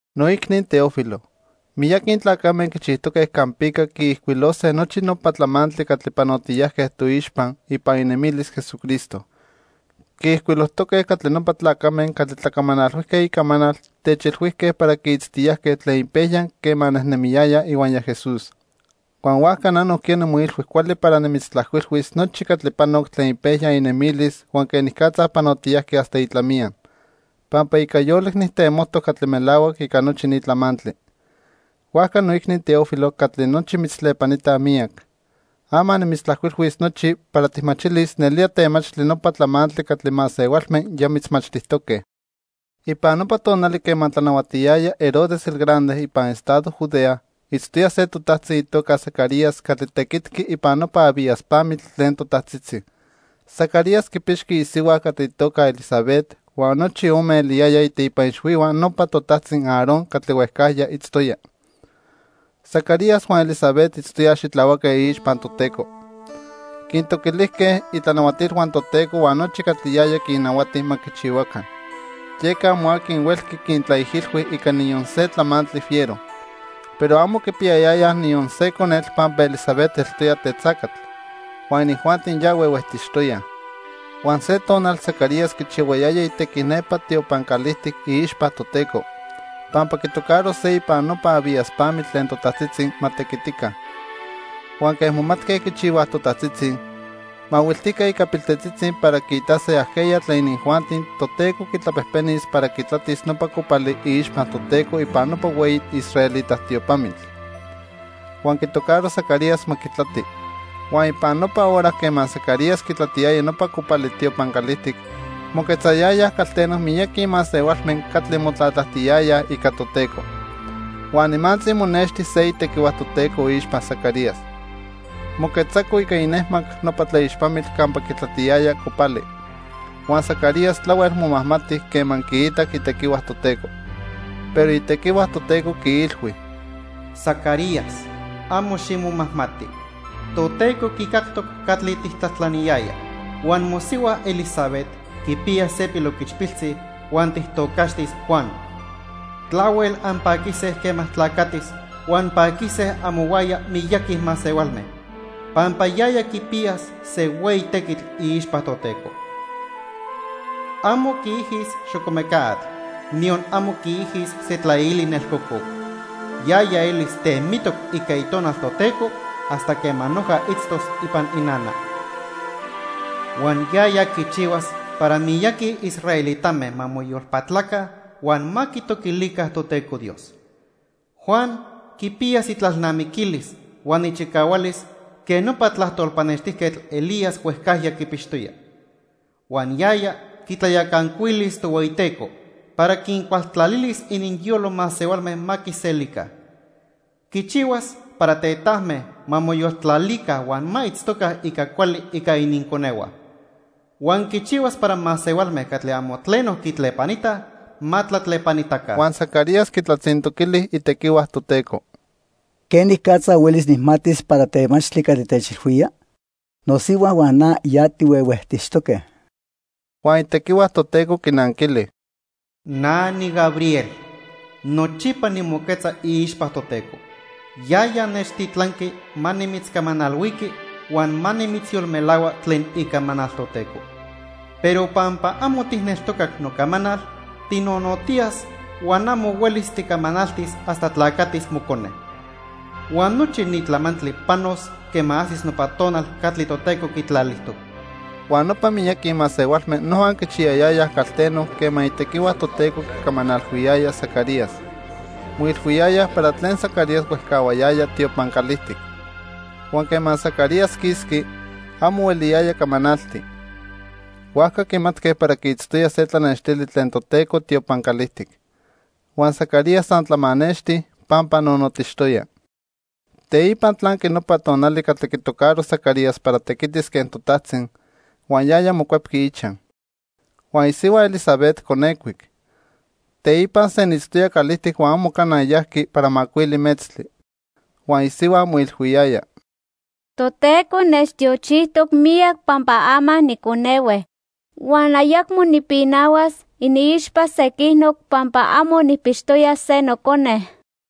Noicni Teófilo, miyaqui tlacame quichijtoque campica quiijcuilose nochi nopa tlamantli catli panotiyajque toixpa ipan inemilis Jesucristo. Quiijcuilojtoque catli nopa tlacame catli tlacamanalhuijque icamanal techilhuijque para quiitztiyajque tlen ipejya quema nejnemiyayaj ihuaya Jesús. Huan huajca na nojquiya nimoilhui cuali para nimitztlajcuilhuis nochi catli panoc tlen ipejya inemilis huan quenicatza panotiyajqui hasta itlamiya, pampa ica yolic nijtemojtoc catli melahuac ica nochi ni tlamantli. Huajca noicni Teófilo catli nochi mitztlepanitaj miyac, ama nimitztlajcuilhuis nochi para tijmachilis nelía temachtli nopa tlamantli catli masehualme ya mitzmachtijtoque. Ipan nopa tonali quema tlanahuatiyaya Herodes el Grande ipan estado Judea, itztoya se totajtzi itoca Zacarías catli tequitqui ipan nopa Abías pamitl tlen totajtzitzi. Zacarías quipixqui isihua catli itoca Elisabet huan nochi ome eliyayaj iteipa ixhuihua nopa totajtzi Aarón catli huejcajya itztoya. Zacarías huan Elisabet itztoyaj xitlahuaque iixpa Toteco. Quintoquilijque itlanahuatilhua Toteco huan nochi catli yaya quinnahuati ma quichihuaca. Yeca amo aqui huelqui quintlaijilhui ica niyon se tlamantli fiero. Pero amo quipiyayayaj niyon se conetl pampa Elisabet eltoya tetzacatl, huan inijuanti ya huehuejtixtoyaj. Huan se tonal Zacarías quichihuayaya itequi nepa tiopan calijtic iixpa Toteco, pampa quitocaro se ipan nopa Abías pamitl tlen totajtzitzi ma tequitica. Huan quen momatque quichihuaj totajtzitzi, mahuiltijque ica piltetzitzi para quiitase ajqueya tlen inijuanti Toteco quitlapejpenis para quitlatis nopa copali iixpa Toteco ipan nopa hueyi israelita tiopamitl. Huan quitocaro Zacarías ma quitlati. Huan ipan nopa hora quema Zacarías quitlatiyaya nopa copali tiopan calijtic, moquetzayayaj calteno miyaqui masehualme catli motlatlajtiyayaj ica Toteco. Huan nimantzi monexti se itequihua Toteco iixpa Zacarías. Moquetzaco ica inejmac nopa tlaixpamitl campa quitlatiyaya copali. Huan Zacarías tlahuel momajmati quema quiitac itequihua Toteco. Pero itequihua Toteco quiilhui: —Zacarías, amo ximomajmati. Toteco quicactoc catli tijtlajtlaniyaya, huan mosihua Elisabet quipiyas se piloquichpiltzi huan tijtocaxtis Juan. Tlahuel anpaquise quema tlacatis huan paquise amohuaya miyaqui masehualme, pampa yaya quipiyas se hueyi tequitl iixpa Toteco. Amo quiijis xocomeca atl, niyon amo quiijis se tlaili nelcococ. Yaya elis temitoc ica Itonal Toteco hasta quema noja itztos ipan inana. Huan yaya quichihuas para miyaqui israelitame ma moyolpatlaca huan ma quitoquilica Toteco Dios. Juan quipiyas itlalnamiquilis huan ichicahualis quen nopa tlajtol pannextijquetl Elías huejcajya quipixtoya. Huan yaya quitlayacancuilis Tohueyiteco para quincualtlalilis ininyolo masehualme ma quiselica. Quichihuas para tetajme ma moyoltlalica huan ma itztoca ica cuali ica ininconehua. Huan quichihuas para masehualme catli amo tleno quitlepanitaj, ma tlatlepanitaca. Huan Zacarías quitlatzintoquili itequihua Toteco: —¿Quenicatza huelis nijmatis para temachtli catli techilhuía? Nosihua huan na ya tihuehuejtixtoque. Huan itequihua Toteco quinanquili: —Na niGabriel. Nochipa nimoquetza iixpa Toteco. Yaya nechtitlanqui ma nimitzcamanalhuiqui huan ma nimitzyolmelahua tlen icamanal Toteco. Pero pampa amo tijneltocac nocamanal, tinonotiyas huan amo huelis ticamanaltis hasta tlacatis mocone. Huan nochi ni tlamantli panos quema ajsis nopa tonal catli Toteco quitlalijtoc. Huan nopa miyaqui masehualme noja quichiyayayaj calteno quema itequihua Toteco quicamanalhuiyaya Zacarías. Moilhuiyayaj para tlen Zacarías huejcahuayaya tiopan calijtic. Huan quema Zacarías quisqui, amo hueliyaya camanalti. Huajca quimatque para quiitztoya se tlanextili tlen Toteco tiopan calijtic. Huan Zacarías san tlamanexti, pampa nonotixtoya. Teipa tlanqui nopa tonali catli quitocaro Zacarías para tequitis quen totajtzi, huan yaya mocuepqui ichaj. Huan isihua Elisabet conecuic. Teipa senitztoya calijtic huan amo cana yajqui para macuili metztli. Huan isihua moilhuiyaya: "Toteco nechtiochijtoc miyac, pampa ama niconehue huan ayacmo nipinahuas iniixpa sequinoc pampa amo nijpixtoya se nocone."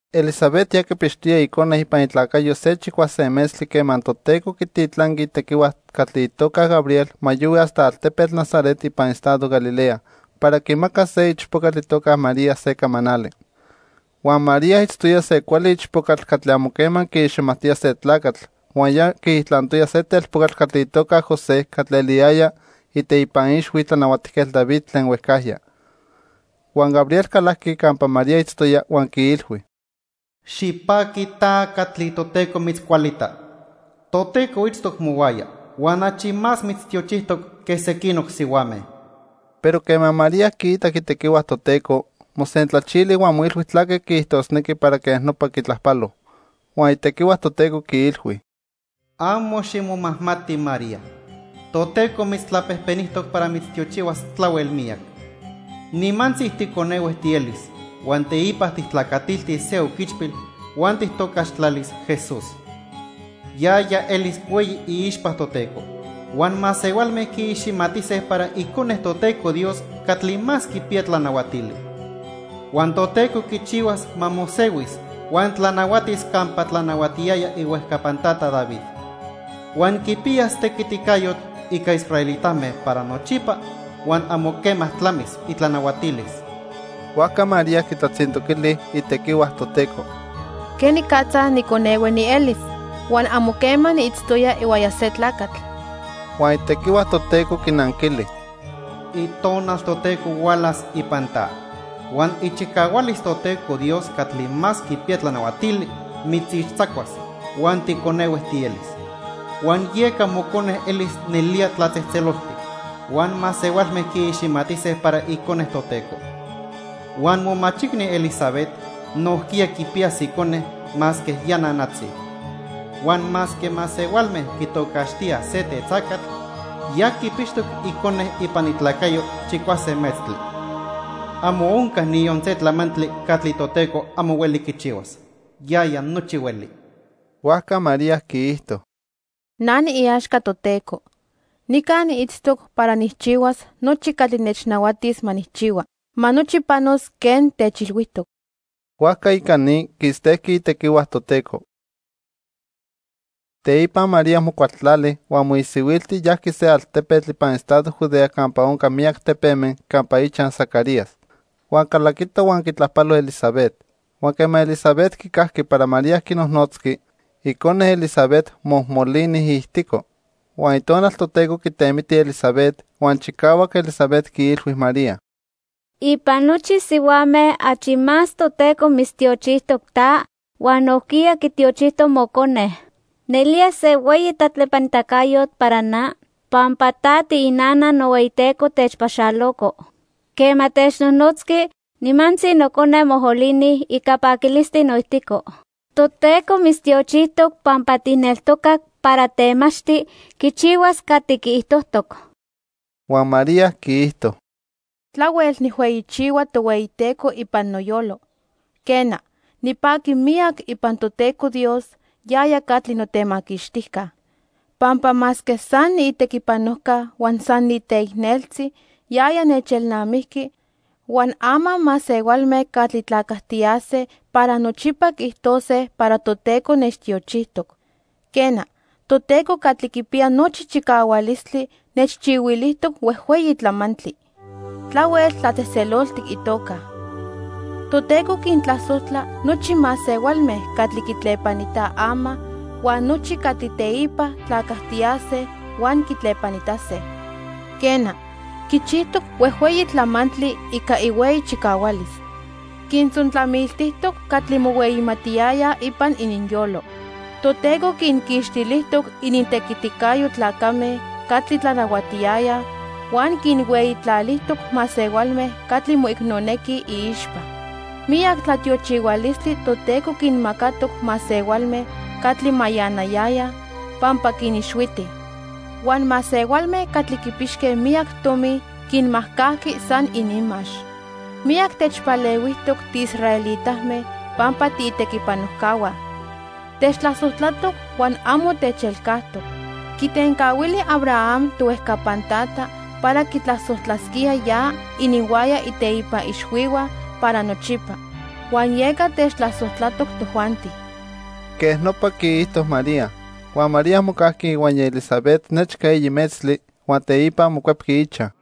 Elisabet ya quipixtoya icone ipan itlacayo se chicuase metztli quema Toteco quititlanqui itequihua catli itoca Gabriel ma yohui hasta altepetl Nazaret ipan estado Galilea para quimacas se ichpocatl itoca María se camanali. Huan María itztoya se cuali ichpocatl catli amo quema quiiximajtoya se tlacatl huan ya quiijtlantoya se telpocatl catli itoca José catli eliyaya iteipa ixhui Tlanahuatijquetl David tlen huejcajya. Huan Gabriel calajqui campa María itztoya huan quiilhui: —Xipaqui ta catli Toteco mitzcualita. Toteco itztoc mohuaya huan achi más mitztiochijtoc que sequinoc sihuame. Pero quema María quiitac itequihua Toteco, mosentlachili huan moilhui tlaque quiijtosnequi para quej nopa quitlajpalo. Huan itequihua Toteco quiilhui: —Amo ximomajmati María. Toteco mitztlapejpenijtoc para mitztiochihuas tlahuel miyac. Nimantzi ticonehue tielis huan teipa tijtlacatiltis se oquichpil huan tijtocaxtlalis Jesús. Yaya elis hueyi iixpa Toteco. Huan masehualme quiiximatise para Icone Toteco Dios Catli Más Quipiya Tlanahuatili. Huan Toteco quichihuas ma mosehuis huan tlanahuatis campa tlanahuatiyaya ihuejcapan tata David. Huan quipiyas tequiticayotl ica israelitame para nochipa huan amo quema tlamis itlanahuatilis. Huajca María quitlatzintoquili itequihua Toteco: —¿Quenicatza niconehue nielis huan amo quema niitztoya ihuaya se tlacatl? Huan itequihua Toteco quinanquili: —Itonal Toteco hualas ipan ta, huan ichicahualis Toteco Dios Catli Más Quipiya Tlanahuatili mitzixtzacuas huan ticonehue tielis. Huan yeca mocone elis nelía tlatzejtzeloltic, huan masehualme quiiximatise para Icone Toteco. Huan momachicni Elisabet nojquiya quipiyas icone masque ya nanatzi. Huan masque masehualme quitocaxtíaj se tetzacatl, ya quipixtoc icone ipan itlacayo chicuase metztli. Amo onca niyon se tlamantli catli Toteco amo hueli quichihuas. Yaya nochi hueli. Huajca María quiijto: —Na niiaxca Toteco. Nica niitztoc para nijchihuas nochi catli nechnahuatis ma nijchihua. Ma nochi panos quen techilhuijtoc. Huajca ica ni, quistejqui itequihua Toteco. Teipa María mocualtlali huan moisihuilti yajqui se altepetl ipan estado Judea campa onca miyac tepeme, campa ichaj Zacarías. Huan calaquito huan quitlajpalo Elisabet. Huan quema Elisabet quicajqui para María quinojnotzqui, icone Elisabet mojmolini iijtico. Huan Itonal Toteco quitemiti Elisabet, huan chicahuac Elisabet quiilhui María: —Ipan nochi sihuame achi más Toteco mitztiochijtoc ta, huan nojquiya quitiochijtoc mocone. Nelía se hueyi tlatlepanitacayotl para na, pampa ta tiinana nohueyiTeco techpaxaloco. Quema technojnotzqui, nimantzi nocone mojmolini ica paquilistli noijtico. Toteco mitztiochijtoc pampa tijneltocac para temachtli quichihuas catli quiijtojtoc. Huan María quiijto: "Tlahuel nijhueyichihua Tohueyiteco ipan noyolo. Quena, nipaqui miyac ipan Toteco Dios, yaya catli notemaquixtijca. Pampa masque san niitequipanojca, huan san niteicneltzi, yaya nechelnamijqui, huan ama masehualme catli tlacajtiyase para nochipa quiijtose para Toteco nechtiochijtoc. Quena, Toteco Catli Quipiya Nochi Chicahualistli nechchihuilijtoc huejhueyi tlamantli. Tlahuel tlatzejtzeloltic itoca. Toteco quintlasojtla nochi masehualme catli quitlepanitaj ama, huan nochi catli teipa tlacajtiyase huan quitlepanitase. Quena, quichijtoc huejhueyi tlamantli ica ihueyi chicahualis. Quintzontlamiltijtoc catli mohueyimatiyayaj ipan ininyolo. Toteco quinquixtilijtoc inintequiticayo tlacame catli tlanahuatiyayaj, huan quinhueyitlalijtoc masehualme catli moicnonequij iixpa. Miyac tlatiochihualistli Toteco quinmacatoc masehualme catli mayanayayaj, pampa quinixhuiti. Huan masehualme catli quipixque miyac tomi quinmajcajqui san ininmax. Miyac techpalehuijtoc tiisraelitame pampa tiitequipanojcahua. Techtlasojtlatoc huan amo techelcajtoc. Quitencahuili Abraham, tohuejcapan tata, para quitlasojtlasquía ya ininhuaya iteipa ixhuihua para nochipa, huan yeca techtlasojtlatoc tojuanti." Quej nopa quiijto María. Huan María mocajqui ihuaya Elisabet nechca eyi metztli, huan teipa mocuepqui ichaj.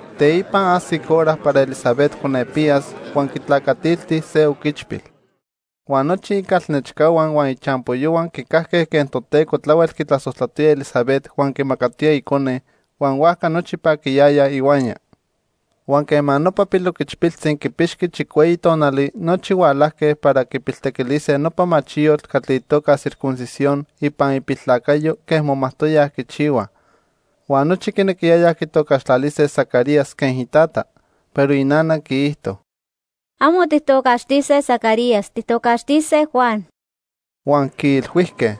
Teipa ajsic hora para Elisabet conepiyas, huan quitlacatilti se oquichpil. Huan nochi icalnechcahua huan ichampoyohua quicajque quen Toteco tlahuel quitlasojtlatoya Elisabet huan quimacatoya icone, huan huajca nochi paquiyayaj ihuaya. Huan quema nopa piloquichpiltzi quipixqui chicueyi tonali, nochi hualajque para quipiltequilise nopa machiyotl catli itoca circuncisión ipan ipiltlacayo quen momajtoyaj quichihuaj. Huan nochi quinequiyayaj quitocaxtlalise Zacarías quen itata. Pero inana quiijto: —Amo tijtocaxtise Zacarías, tijtocaxtise Juan. Huan quiilhuijque: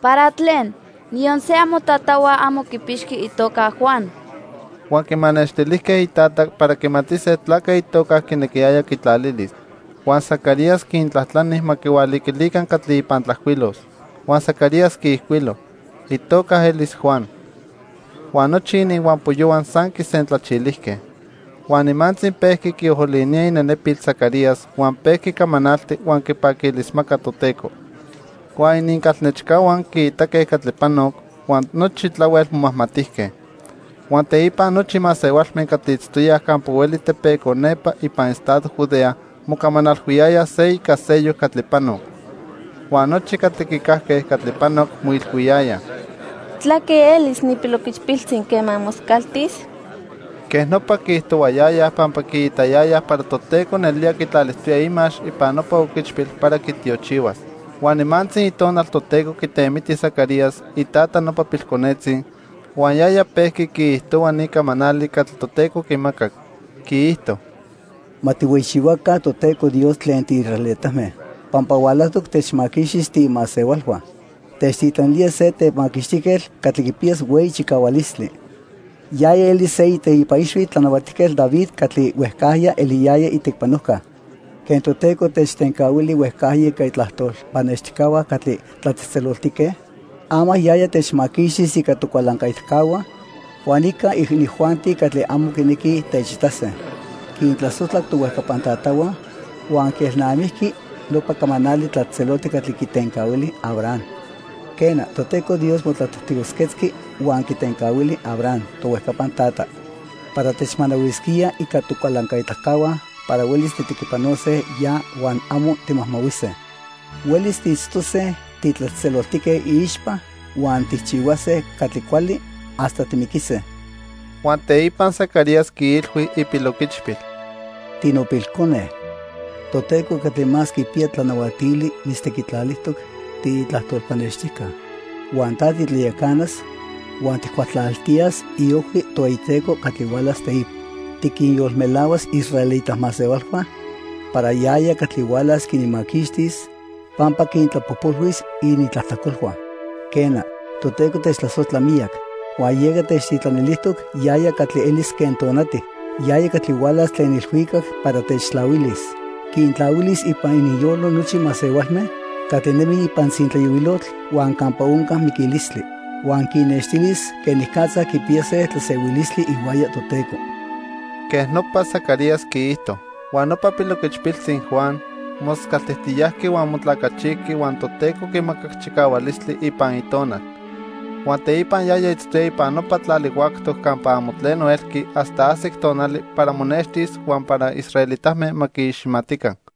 —¿Para tlen? Niyon se amotatahua amo quipixqui itoca Juan. Huan quimanextilijque itata para quimatise tlaque itoca quinequiyaya quitlalilis. Huan Zacarías quintlajtlani ma quihualiquilica catli ipan tlajcuilos. Huan Zacarías quiijcuilo: "Itoca elis Juan." Huan nochi ininhuampoyohua san quisentlachilijque. Huan nimantzi pejqui quiolinía inenepil Zacarías, huan pejqui camanalti huan quipaquilismaca Toteco. Huan inincalnechcahua quiitaque catli panoc, huan nochi tlahuel momajmatijque. Huan teipa nochi masehualme catli itztoyaj campa hueli tepeco nepa ipan estado Judea mocamanalhuiyayaj se ica seyoc catli panoc. Huan nochi catli quicajque catli panoc moilhuiyayaj: "¿Tlaque elis ni piloquichpiltzi quema moscaltis?" Quej nopa quiijtohuayayaj pampa quiitayayaj para Toteco nelía quitlalijtoya imax ipan nopa oquichpil para quitiochihuas. Huan nimantzi Itonal Toteco quitemiti Zacarías, itata nopa pilconetzi, huan yaya pejqui quiijtohua ni camanali catli Toteco quimacac. Quiijto: "Ma tijhueyichihuaca Toteco Dios tlen tiisraelitame, pampa hualajtoc techmaquixtis tiimasehualhua. Techtitlanilía se Temaquixtijquetl catli quipiyas hueyi chicahualistli. Yaya elis se iteipa ixhui Tlanahuatijquetl David catli huejcajya eliyaya itequipanojca. Quen Toteco techtencahuili huejcajya ica itlajtol pannextijcahua catli tlatzejtzeloltique, ama yaya techmaquixtis ica tocualancaitacahua huan ica inijuanti catli amo quinequij techitase. Quintlasojtlac tohuejcapan tatahua, huan quielnamijqui nopa camanali tlatzejtzeloltic catli quitencahuili Abraham. Quena, Toteco Dios motlatestigojquetzqui huan quitencahuili Abraham, tohuejcapan tata, para techmanahuisquía ica tocualancaitacahua para huelis tijtequipanose ya huan amo timajmahuise. Huelis tiitztose titlatzejtzeloltique iixpa huan tijchihuase catli cuali hasta timiquise." Huan teipa Zacarías quiilhui ipiloquichpil: "Tinopilcone, Toteco Catli Más Quipiya Tlanahuatili mitztequitlalijtoc tiitlajtol pannextijca, huan ta titlayacanas huan tijcualtlalijtiyas iojhui Tohueyiteco catli hualas teipa. Tiquinyolmelahuas iisraelita masehualhua para yaya catli hualas quinmaquixtis, pampa quintlapojpolhuis inintlajtlacolhua. Quena, Toteco techtlasojtla miyac, huan yeca techtitlanilijtoc yaya catli elis quen tonati, yaya catli hualas tlen ilhuicac para techtlahuilis. Quintlahuilis ipan ininyolo nochi masehualme catli nemij ipan tzintlayohuilotl huan campa onca miquilistli. Huan quinnextilis quenicatza quipiyase tlasehuilistli ihuaya Toteco." Quej nopa Zacarías quiijto. Huan nopa piloquichpiltzi Juan moscaltijtiyajqui huan motlacachijqui huan Toteco quimacac chicahualistli ipan itonal. Huan teipa yaya itztoya ipan nopa tlali huactoc campa amo tleno elqui hasta ajsic tonali para monextis huan para israelitame ma quiiximatica.